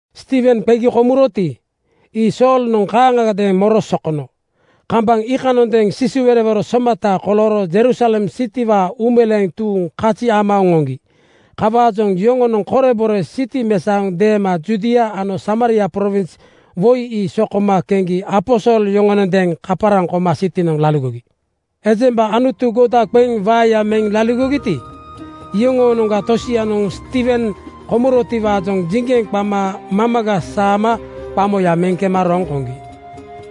Stiiwen qegi komuroti, ii Soolnoŋ kaaŋagadeeŋ moro sokono. Kambaŋ iikanoŋadeeŋ sisiwerowero somata kolooro Jerusalem sitiwaa uumeleeŋ tuuŋ kazi ama oŋoŋgi. Kawaajoŋ yoŋonoŋ korebore siti mesaoŋ deema Judia ano Samaria prowins woi ii sokoma keŋgi aposol yoŋonondeeŋ kaparaŋ koma sitinoŋ laligogi. Ejemba Anutu goda qeŋ waeya meŋ laligogiti, iyoŋoonoŋga tosianoŋ Stiiwen komurotiwaajoŋ jiŋgeŋ qama mamaga saama qamoya meŋ kema roŋ koŋgi.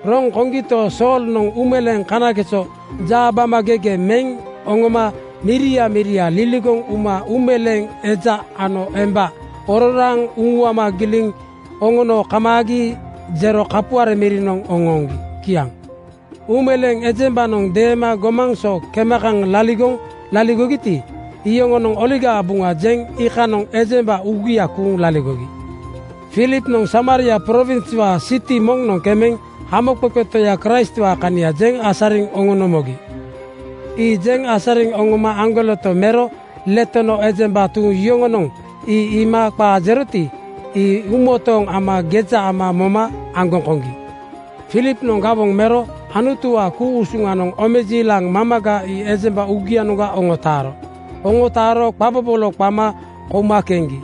Roŋ koŋgito, Soolnoŋ uumeleeŋ kanageso jaabamagege meŋ oŋoma miria miria liligoŋ uma uumeleeŋ eja ano emba ororaaŋ uŋuama giliŋ oŋono kamaagi jero kapuare mirinoŋ oŋooŋgi. Kiaŋ. Uumeleeŋ ejembanoŋ deema gomaŋ so kema kaŋ liligoŋ laligogiti, iyoŋonoŋ Oligaa Buŋa jeŋ iikanoŋ ejemba uugia kuuŋ laligogi. Filipnoŋ Samaria prowinswaa siti moŋnoŋ kemeŋ Hamoqeqe Toya Kraistwaa kania jeŋ asariŋ oŋono mogi. Ii jeŋ asariŋ oŋoma aŋgoleto mero letono ejemba tuuŋ yoŋonoŋ ii iima qaa jeroti, ii uumotooŋ ama geja ama moma aŋgoŋ koŋgi. Filipnoŋ gawoŋ mero Anutuwaa ku-usuŋanoŋ omejiilaŋ mamaga ii ejemba uugianoŋga oŋotaaro. Oŋotaaro qa bobolo qama kouma keŋgi.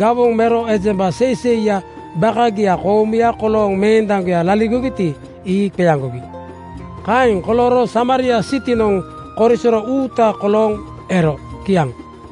Gawoŋ mero ejemba seiseiya bakagia koomuya kolooŋ meendaŋgoya laligogiti, ii qeaŋgogi. Kaeŋ kolooro Samaria sitinoŋ korisoro uuta kolooŋ ero. Kiaŋ.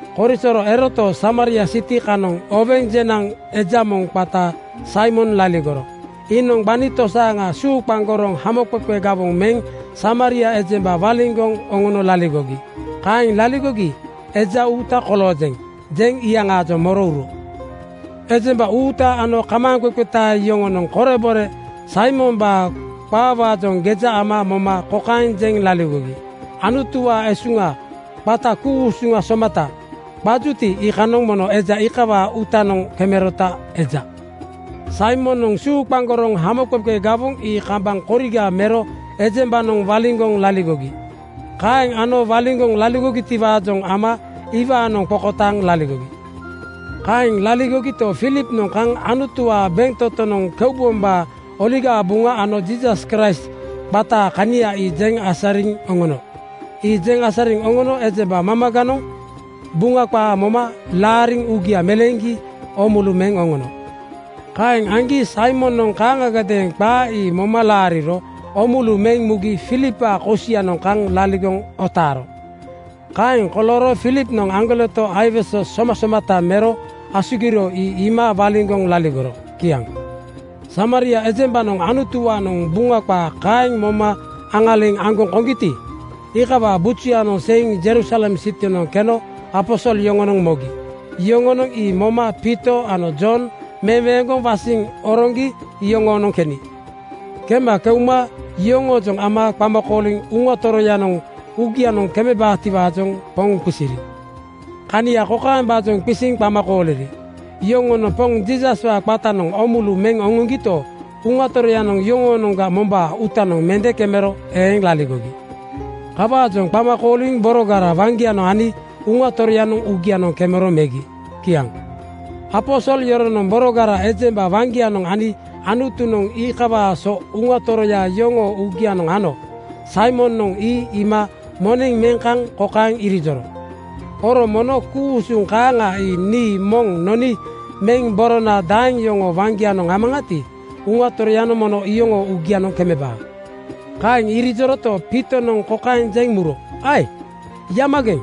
Korisoro eroto, Samaria siti kanoŋ oweŋ jenaŋ eja moŋ qata Saimon laligoro. Iinoŋ gbani tosaaŋa suuqaŋgoroŋ hamoqeqe gawoŋ meŋ Samaria ejemba waliŋgoŋ oŋono laligogi. Kaeŋ laligogi “Eja uuta koloojeŋ,” jeŋ iyaŋaajoŋ moro uro. Ejemba uuta ano kamaaŋqeqeta yoŋonoŋ korebore Saimombaa qaawaajoŋ geja ama moma kokaeŋ jeŋ laligogi, “Anutuwaa esuŋa qata ‘Ku-usuŋ somata,’ qajuti, iikanoŋ mono eja kawaa uutanoŋ kemerota eja.” Saimonoŋ suuqaŋgoroŋ hamoqeqe gawoŋ ii kambaŋ koriga mero ejembanoŋ waliŋgoŋ laligogi. Kaeŋ ano waliŋgoŋ laligotiwaajoŋ ama iwaanoŋ qokotaaŋ laligogi. Kaeŋ laligogito, Filipnoŋ kaŋ Anutuwaa bentotonoŋ keubombaa Oligaa Buŋa ano Jiisas Kraist qataa kania ii jeŋ asariŋ oŋono. Ii jeŋ asariŋ oŋono ejemba mamaganoŋ Buŋa qaa moma laariŋ uugia meleeŋgi oomulu meŋ oŋono. Kaeŋ aŋgi Saimonoŋ kaaŋagadeeŋ qaa ii moma laariro oomulu meŋ mugi Filipwaa kosianoŋ kaŋ laligoŋ otaaro. Kaeŋ kolooro Filipnoŋ aŋgoleto aiwese somasomata mero asugiro ii iima waliŋgoŋ laligoro. Kiaŋ. Samaria ejembanoŋ Anutuwaanoŋ Buŋa qaa kaeŋ moma aŋaliŋ aŋgoŋ koŋgiti, iikawaa bujuyanoŋ seiŋ Jerusalem sitinoŋ keno aposol yoŋonoŋ mogi. Yoŋonoŋ ii moma Piito ano Jon meweeŋgoŋ wasiŋ oroŋgi yoŋoonoŋ keni. Kema keuma yoŋoojoŋ ama qama kooliŋ Uŋa Toroyanoŋ uugianoŋ kemebaatiwaajoŋ Poŋ qisiri. Kania kokaembaajoŋ qisiŋ qama kooliri: Yoŋonoŋ Poŋ Jiisaswaa qatanoŋ oomulu meŋ oŋoŋgito, Uŋa Toroyanoŋ yoŋoonoŋga mombaa uutanoŋ mende kemero eeŋ laligogi. Kawaajoŋ qama kooliŋ borogara waŋgianoŋ ani Uŋa Toroyanoŋ uugianoŋ kemero megi. Kiaŋ. Aposol yoronoŋ borogara ejemba waŋgianoŋ ani Anutunoŋ iikawaa so Uŋa Toroya yoŋoo uugianoŋ ano Saimonoŋ ii iima moneŋ meŋ kaŋ kokaeŋ irijoro, “Oro mono ku-usuŋ kaaŋa ii nii moŋ noni meŋ borona daeŋ yoŋoo waŋgianoŋ amaŋati, Uŋa Toroyanoŋ mono iyoŋoo uugianoŋ kemebaa.” Kaeŋ irijoroto, Piitonoŋ kokaeŋ jeŋ muro, “Ae! Yamageŋ!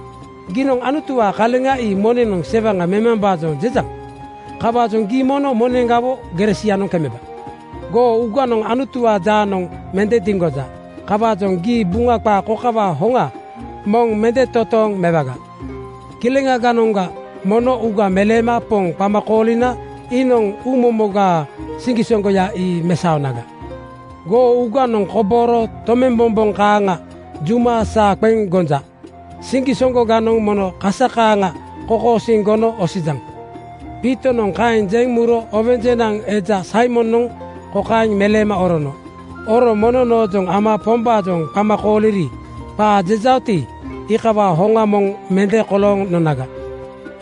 Giinoŋ Anutuwaa kaleŋa ii moneŋnoŋ sewaŋa memambaajoŋ jejaŋ. Kawaajoŋ gii mono moneŋgawo gere sianoŋ kemeba. Goo uuganoŋ Anutuwaa jaanoŋ mende diŋgoja. Kawaajoŋ gii Buŋa qaa kokawaa hoŋa moŋ mende totooŋ mewaga. Kileŋaganoŋga mono uuga meleema Poŋ qama koolina iinoŋ uumomogaa siŋgisoŋgoya ii mesaonaga. Goo uuganoŋ kobooro tomembombomboŋ kaaŋa juma saa qeŋ gonja. Siŋgisoŋgoganoŋ mono kasa kaaŋa kokosiiŋ gono osijaŋ.” Piitonoŋ kaeŋ jeŋ muro oweŋ jenaŋ eja Saimonoŋ kokaeŋ meleema orono, “Oro mono noojoŋ ama Pombaajoŋ qama kooliri qaa jejaoti, iikawaa hoŋa moŋ mende kolooŋ nonaga.”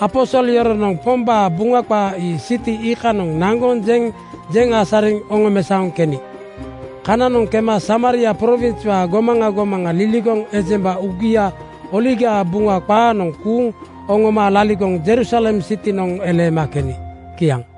Aposol yoronoŋ Pombaa Buŋa qaa ii siti iikanoŋ naŋgoŋ jeŋ jeŋ asariŋ oŋomesaoŋ keni. Kananoŋ kema Samaria prowinswaa gomaŋa gomaŋa liligoŋ ejemba uugia Oligaa Buŋa qaanoŋ kuuŋ oŋoma laligoŋ Jerusalem sitinoŋ eleema keni. Kiaŋ.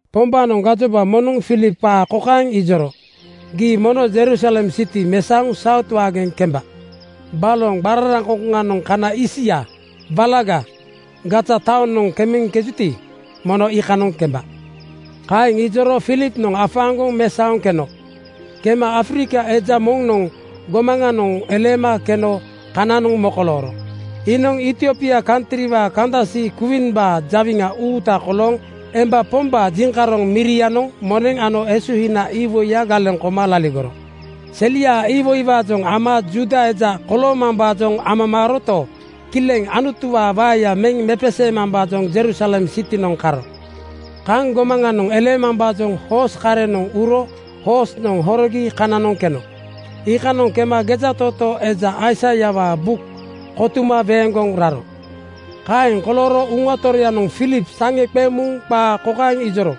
Pombaanoŋ gajoba moŋnoŋ Filip qaa kokaeŋ ijoro, “Gii mono Jerusalem siti mesaoŋ Saut waageŋ kemba. Baloŋ qararaŋkoŋkoŋanoŋ kana isia (walaga) Gaza taonoŋ kemeŋkejuti, mono iikanoŋ kemba.” Kaeŋ ijoro Filipnoŋ afaaŋgoŋ mesaoŋ keno. Kema Afrika eja moŋnoŋ gomaŋanoŋ eleema keno kananoŋ mokolooro. Iinoŋ Etiopia kantriwaa kandasi kwiimbaa jawiŋa uuta kolooŋ emba pombaa jiŋkaroŋ mirianoŋ moneŋ ano esuhina iwoiya galeŋ koma laligoro. Seliaa iwoiwaajoŋ ama Juuda eja koloomambaajoŋ amamaaroto, kileŋ Anutuwaa waeya meŋ mepeseemambaajoŋ Jerusalem sitinoŋ karo. Kaŋ gomaŋanoŋ eleemambaajoŋ hoos karenoŋ uro hoosnoŋ horogi kananoŋ keno. Iikanoŋ kema gejatootoo eja Aisaiawaa buk kotuma weeŋgoŋ raro. Kaeŋ kolooro Uŋa Toroyanoŋ Filip saŋe qeŋ muŋ qaa kokaeŋ ijoro,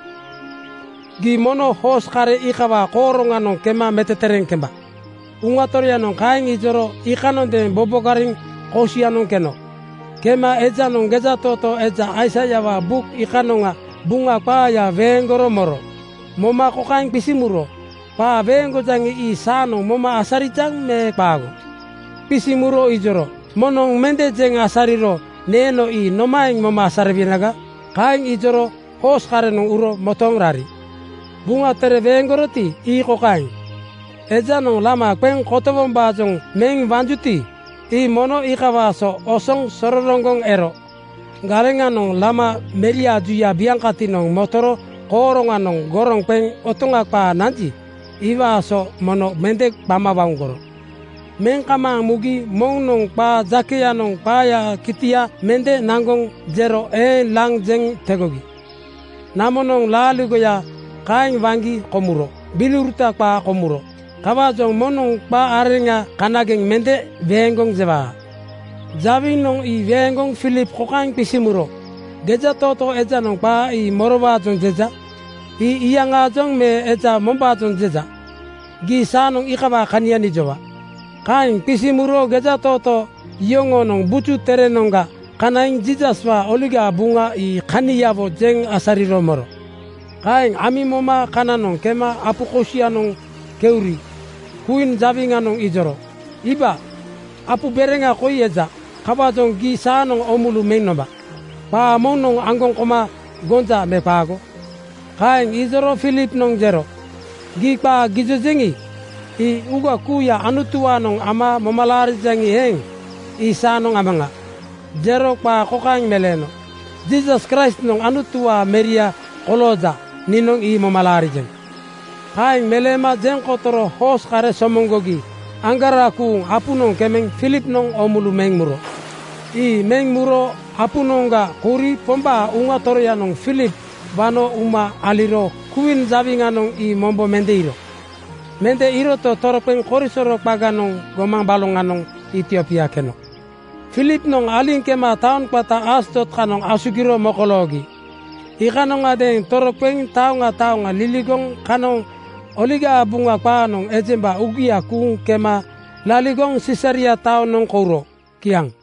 “Gii mono hoos kare iikawaa kooroŋanoŋ kema metetereeŋ kemba.” Uŋa Toroyanoŋ kaeŋ ijoro iikanondeeŋ bobogariŋ kosianoŋ keno. Kema ejanoŋ gejatootoo eja Aisaiawaa buk iikanoŋa Buŋa qaaya weeŋgoro moro. Moma kokaeŋ qisiŋ muro, “Qaa weeŋgojaŋi, ii saanoŋ moma asarijaŋ me qaago?” Qisiŋ muro ijoro, “Moŋnoŋ mende jeŋ asariro neeno ii nomaeŋ moma asariwenaga?” Kaeŋ ijoro hoos karenoŋ uro motooŋ rari. Buŋa Tere weeŋgoroti, ii kokaeŋ, “Ejanoŋ lama qeŋ kotowombaajoŋ meŋ wanjuti, ii mono iikawaa so osoŋ sororoŋgoŋ ero. Galeŋanoŋ lama meriaa juya biaŋkatinoŋ motoro kooroŋanoŋ goroŋ qeŋ otoŋa qaa nanji, iwaa so mono mende qama wauŋgoro. Meŋ kamaaŋ mugi moŋnoŋ qaa jakeyanoŋ qaayaa kitia mende naŋgoŋ jero eeŋ laŋ jeŋ tegogi. Namonoŋ laaligoya kaeŋ waŋgi komuro. Gbiliuruta qaa komuro. Kawaajoŋ moŋnoŋ qa areŋa kanageŋ mende weeŋgoŋ jewaa.” Jawinoŋ ii weeŋgoŋ Filip kokaeŋ qisiŋ muro, “Gejatootoo ejanoŋ qaa ii morowaajoŋ jeja? Ii iyaŋaajoŋ me eja mombaajoŋ jeja? Gii saanoŋ iikawaa kania nijowa.” Kaeŋ qisiŋ muro gejatootoo yoŋoonoŋ Buju Terenoŋga kanaiŋ Jiisaswaa Oligaa Buŋa ii kaniawo jeŋ asariro moro. Kaeŋ amiŋ moma kananoŋ kema apu kosianoŋ keuri kwiin jawiŋanoŋ ijoro, “Iiba, apu bereŋa koi eja. Kawaajoŋ gii saanoŋ oomulu meŋ nomba. Qaa moŋnoŋ aŋgoŋ koma gonja me qaago?” (Kaeŋ ijoro Filipnoŋ jero, “Gii qaa gijojeŋi, ii uuga kuuya Anutuwaanoŋ ama moma laarijaŋi eeŋ, ii saanoŋ amaŋa.” Jero qaa kokaeŋ meleeno, “Jiisas Kraistnoŋ Anutuwaa Meria kolooja, niinoŋ ii moma laarijeŋ.” Kaeŋ meleema jeŋ kotoro hoos kare somoŋgogi aŋgarakuŋ apunoŋ kemeŋ Filipnoŋ oomulu meŋ muro. Ii meŋ muro apunoŋga kouri Pombaa Uŋa Toroyanoŋ Filip wano uma aliro kwiin jawiŋanoŋ ii mombo mende iiro. Mende iiroto, toroqeŋ korisoro qaganoŋ gomaŋ baloŋanoŋ Etiopia keno. Filipnoŋ aliŋ kema taoŋ qata Asdod kanoŋ asugiro mokoloogi. Iikanoŋadeeŋ toroqeŋ taoŋa taoŋa liligoŋ kanoŋ Oligaa Buŋa qaanoŋ ejemba uugia kuuŋ kema laligoŋ Sisaria taonoŋ kouro. Kiaŋ.